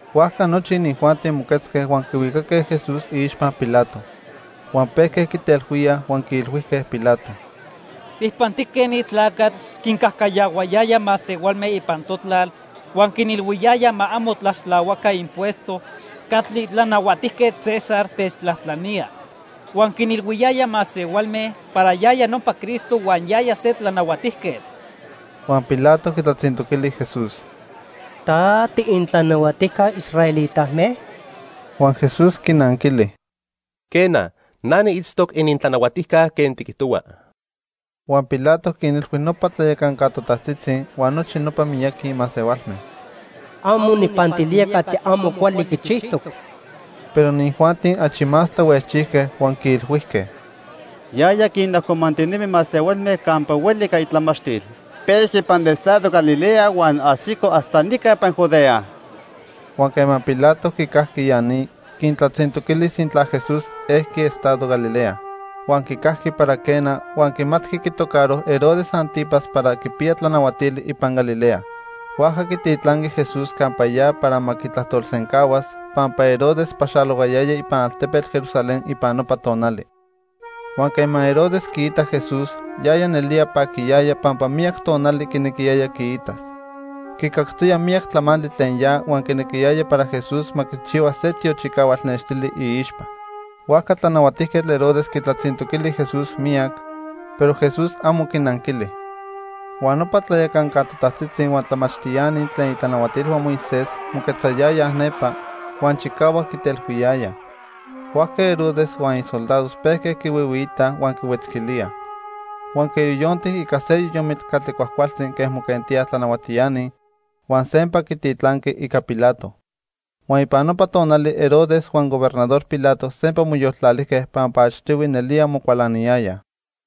Huajca nochi inijuanti moquetzque huan quihuicaque Jesús iixpa Pilato. Huan pejque quitelhuíaj huan quiilhuijque Pilato: —Tijpantijque ni tlacatl quincajcayahuayaya masehualme ipan totlal huan quinilhuiyaya ma amo tlaxtlahuaca impuesto catli Tlanahuatijquetl César techtlajtlanía. Huan quinilhuiyaya masehualme para yaya nopa Cristo huan yaya se tlanahuatijquetl. Huan Pilato quitlatzintoquili Jesús: —¿Ta tiinintlanahuatijca israelitame? Huan Jesús quinanquili: —Quena, na niitztoc inintlanahuatijca quen tiquijtohua. Huan Pilato quinilhui nopa tlayacanca totajtzitzi huan nochi nopa miyaqui masehualme: —Amo nijpantilía catli amo cuali quichijtoc. Pero inijuanti achi más tlahuejchijque huan quiilhuijque: —Yaya quinajcomantinemi masehualme campa hueli ica itlamachtil. Pejqui ipan estado Galilea huan ajsico hasta nica ipan Judea. Huan quema Pilato quicajqui ya ni, quintlatzintoquili sintla Jesús ejqui estado Galilea. Huan quicajqui para quena, huan quimatqui quitocaro Herodes 'Antipas para quipiya tlanahuatili ipan Galilea. Huajca quititlanqui Jesús campa ya para ma quitlajtolsencahuas, pampa Herodes paxalohuayaya ipan altepetl Jerusalén ipan nopa tonali. Huan quema Herodes quiitac Jesús, yaya nelía paquiyaya pampa miyac tonali quinequiyaya quiitas. Quicactoya miyac tlamantli tlen ya huan quinequiyaya para Jesús ma quichihua se tiochicahual nextili iixpa. Huajca Tlanahuatijquetl Herodes quitlatzintoquili Jesús miyac, pero Jesús amo quinanquili. Huan nopa tlayacanca totajtzitzi huan tlamachtiani tlen itlanahuatilhua Moisés moquetzayayaj nepa, huan chicahuac quitelhuiyayaj. Huajca Herodes huan isoldados pejque quihuihuiitaj huan quihuetzquilíaj. Huan quiyoyonti ica se yoyomitl catli cuajcualtzi quen moquentíaj tlanahuatiani, huan sempa quititlanqui ica Pilato. Huan ipan nopa tonali Herodes huan Gobernador Pilato sempa moyoltlalijque pampa achtihui nelía mocualaniyayaj.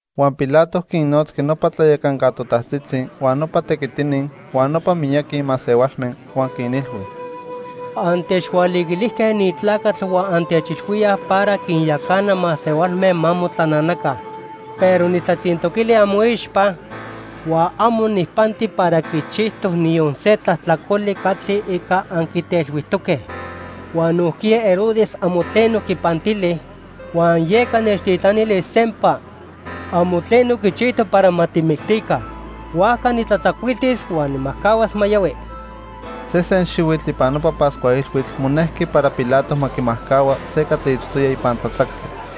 Huan Pilato quinnotzqui nopa tlayacanca totajtzitzi, huan nopa tequitini, huan nopa miyaqui masehualme huan quinilhui: —Antechhualiquilijque ni tlacatl huan antechilhuíaj para quinyacana masehualme ma motlananaca. Pero nijtlatzintoquili amoixpa, huan amo nijpanti para quichijtoc niyon se tlajtlacoli catli ica anquitelhuijtoque. Huan nojquiya Herodes amo tleno quipantili, huan yeca nechtitlanili sempa. Amo tleno quichijtoc para ma tijmictica. Huajca nijtlatzacuiltis huan nijmajcahuas ma yohui. Sesen xihuitl ipan nopa Pascua Ilhuitl monejqui para Pilato ma quimajcahua se catli itztoya ipan tlatzactli.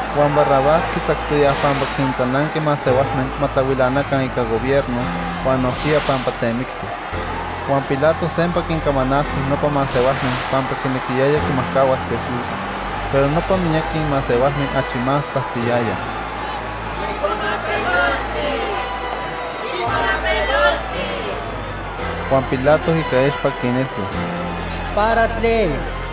Huan Barrabás quitzactoyaj pampa quintlananqui masehualme ma tlahuilanaca ica gobierno, huan nojquiya pampa temicti. Huan Pilato sempa quincamanalhui nopa masehualme pampa quinequiyaya quimajcahuas Jesús, pero nopa miyaqui masehualme achi más tzajtziyayaj: —¡Xijcuamapelolti! ¡Xijcuamapelolti! Huan Pilato ica expa quinilhui: —¿Para tlen?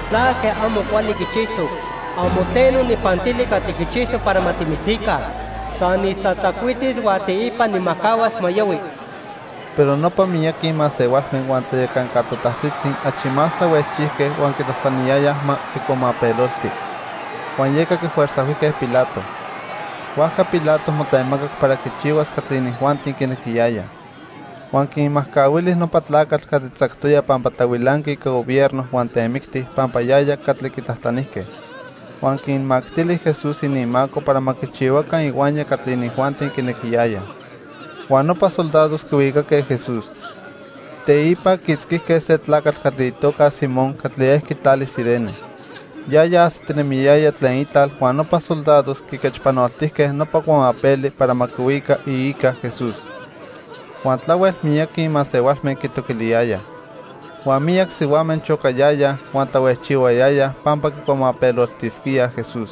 ¿Tlaque amo cuali quichijtoc? Amo tleno nijpantili catli quichijtoc para ma tijmictica. San nijtlatzacuiltis huan teipa nijmajcahuas ma yohui. Pero nopa miyaqui masehualme huan tlayacanca totajtzitzi achi más tlahuejchijque huan quitlajtlaniyayaj ma quicuamapelolti; huan yeca quifuerzajhuijque Pilato. Huajca Pilato motemacac para quichihuas catli inijuanti quinequiyayaj. Huan quinmajcahuili nopa tlacatl catli tzactoya pampa tlahuilanqui ica gobierno huan temicti pampa yaya catli quitlajtlanijque. Huan quinmactili Jesús ininmaco para ma quichihuaca ihuaya catli inijuanti quinequiyayaj. Huan nopa soldados quihuicaque Jesús. Teipa quiitzquijque se tlacatl catli itoca Simón catli ejqui tlali Cirene. Yaya ajsitinemiyaya tlen itlal huan nopa soldados quiquechpanoltijque nopa cuamapeli para ma quihuica iica Jesús. Huan tlahuel miyaqui masehualme quitoquiliyayaj. Huan miyac sihuame chocayayaj huan tlahuejchihuayayaj pampa quicuamapeloltisquíaj Jesús.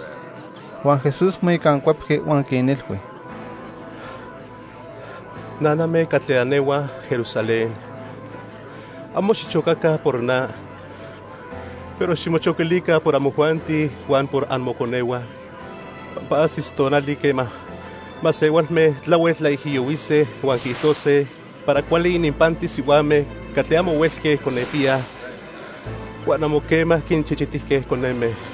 Huan Jesús moicancuepqui huan quinilhui: —Naname catli anehuaj Jerusalén. Amo xichocaca por na, pero ximochoquilica por amojuanti huan por amoconehua. Pampa ajsis tonali quema masehualme tlahuel tlaijiyohuise huan quiijtose para cuali ininpantis sihuame catli amo huelque conepiyaj huan amo quema quinchichitijque coneme.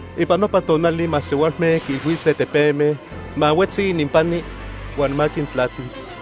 Ipan nopa tonali masehualme quiilhuise tepeme ma huetzi ininpani huan ma quintlatis.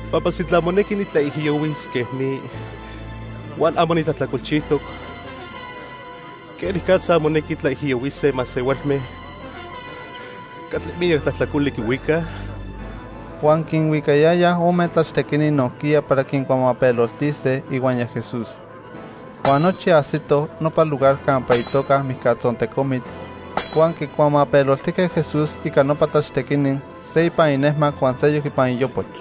Pampa sintla monequi nitlaijiyohuis quen ni, huan amo nitlajtlacolchijtoc, ¿quenicatza monequi tlaijiyohuise masehualme catli miyac tlajtlacoli quihuicaj? Huan quinhuicayayaj ome tlachtequini nojquiya para quincuamapeloltise ihuaya Jesús. Huan nochi ajsitoj nopa lugar campa itoca Mijcatzontecomitl, huan quicuamapeloltijque Jesús ica nopa tlachtequini, se ipan inejmac huan seyoc ipan iopoch.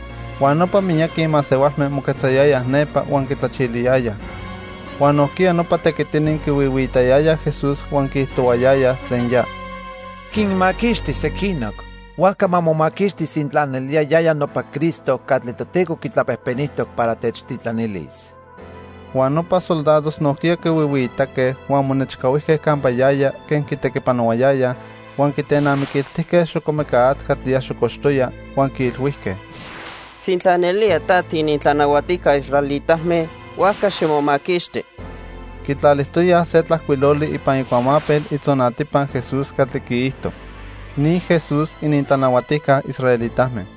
Huan nopa miyaqui masehualme moquetzayayaj nepa huan quitlachiliyayaj. Huan nojquiya nopa tequitini quihuihuiitayayaj Jesús huan quiijtohuayayaj tlen ya: —Quinmaquixti sequinoc, huajca ma momaquixti sintla nelía yaya nopa Cristo catli Toteco quitlapejpenijtoc para techtitlanilis. Huan nopa soldados nojquiya quihuihuiitaque huan monechcahuijque campa yaya quen quitequipanohuayaya huan quitenamiquiltijque xocomeca atl catli ya xocoxtoya, huan quiilhuijque: —Sintla nelía ta tiinintlanahuatijca israelitame, huajca ximomaquixti. Quitlalijtoyaj se tlajcuiloli ipan icuamapel itzonatipa Jesús catli quiijto:|sc NI JES'US ININTLANAHUATIJCA ISRAELITAME|r.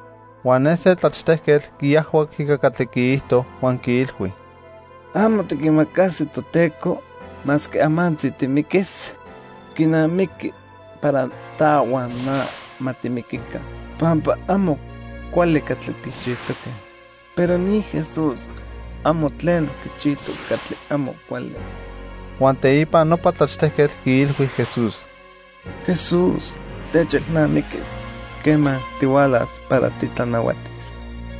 Huan ne se tlachtejquetl quiajhuac ica catli quiijto huan quiilhui: —¿Amo tiquimacasi Toteco, masque amantzi timiquis? Quinamiqui para ta huan na ma timiquica pampa amo cuali catli tijchijtoque, pero ni Jesús amo tleno quichijtoc catli amo cuali. Huan teipa nopa tlachtejquetl quiilhui Jesús: —Jesús, techelnamiquis quema tihualas para titlanahuatis.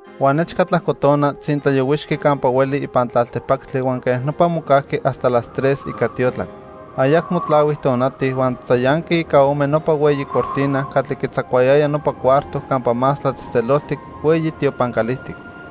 Huan nechca tlajco tona, tzintlayohuixqui campa hueli ipan tlaltipactli huan quej nopa mocajqui hasta las tres ica tiotlac. Ayacmo tlahui tonati, huan tzayanqui ica ome nopa hueyi cortina catli quitzacuayaya nopa cuarto Campa Más Tlatzejtzeloltic hueyi tiopan calijtic.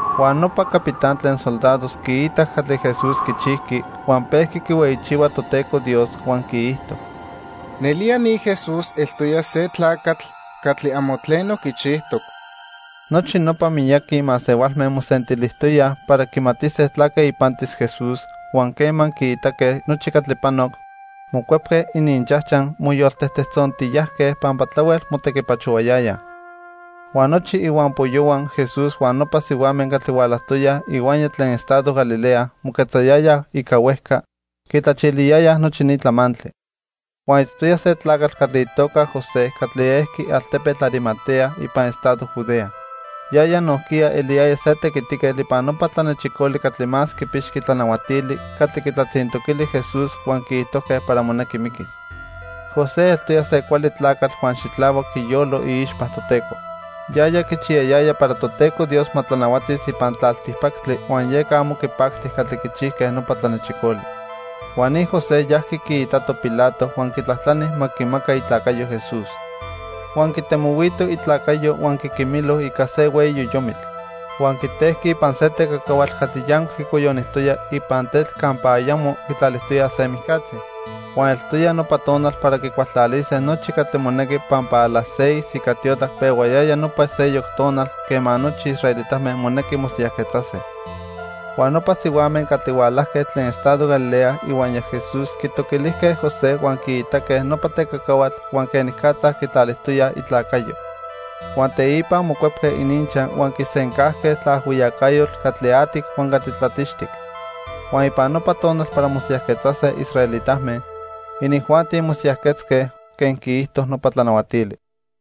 Huan nopa capitán tlen soldados quiitac catli Jesús quichijqui, huan pejqui quihueyichihua Toteco Dios huan quiijto: —Nelía ni Jesús eltoya se tlacatl catli amo tleno quichijtoc. Nochi nopa miyaqui masehualme mosentilijtoyaj para quimatise tlaque ipantis Jesús, huan quema quiitaque nochi catli panoc, mocuepque ininchajchaj moyoltejtejtzontiyajque pampa tlahuel motequipachohuayayaj. Huan nochi ihuampoyohua Jesús huan nopa sihuame catli hualajtoyaj ihuaya tlen estado Galilea moquetzayayaj ica huejca, quitlachiliyayaj nochi ni tlamantli. Huan itztoya se tlacatl catli itoca José catli ejqui altepetl Arimatea ipan estado Judea. Yaya nojquiya eliyaya se tequitiquetl ipan nopa tlanechicoli catli más quipixqui tlanahuatili catli quitlatzintoquili Jesús huan quiijtojque para monequi miquis. José eltoya se cuali tlacatl huan xitlahuac iyolo iixpa Toteco. Yaya quichiyayaya para Toteco Dios ma tlanahuatis ipan tlaltipactli huan yeca amo quipacti catli quichijque nopa tlanechicoli. Huan ni José yajqui quiitato Pilato huan quitlajtlani ma quimaca itlacayo Jesús. Huan quitemohuito itlacayo huan quiquimilo ica se hueyi yoyomitl. Huan quitejqui ipan se tecacahuatl catli yancuic quicoyonijtoya ipan tetl campa ayamo quitlalijtoyaj se mijcatzi. Huan eltoya nopa tonal para quicualtlalise nochi catli monequi pampa a las seis ica tiotlac pehuayaya nopa seyoc tonal quema nochi israelitame monequi mosiyajquetzase. Huan nopa sihuame catli hualajque tlen estado Galilea ihuaya Jesús quitoquilijque José huan quiitaque nopa tecacahuatl huan quenicatza quitlalijtoya itlacayo. Huan teipa mocuepque ininchaj huan quisencajque tlaajhuiyacayotl catli atic huan catli tlatixtic. Huan ipan nopa tonal para mosiyajquetzase israelitame, inijuanti mosiyajquetzque quen quiijto nopa tlanahuatili.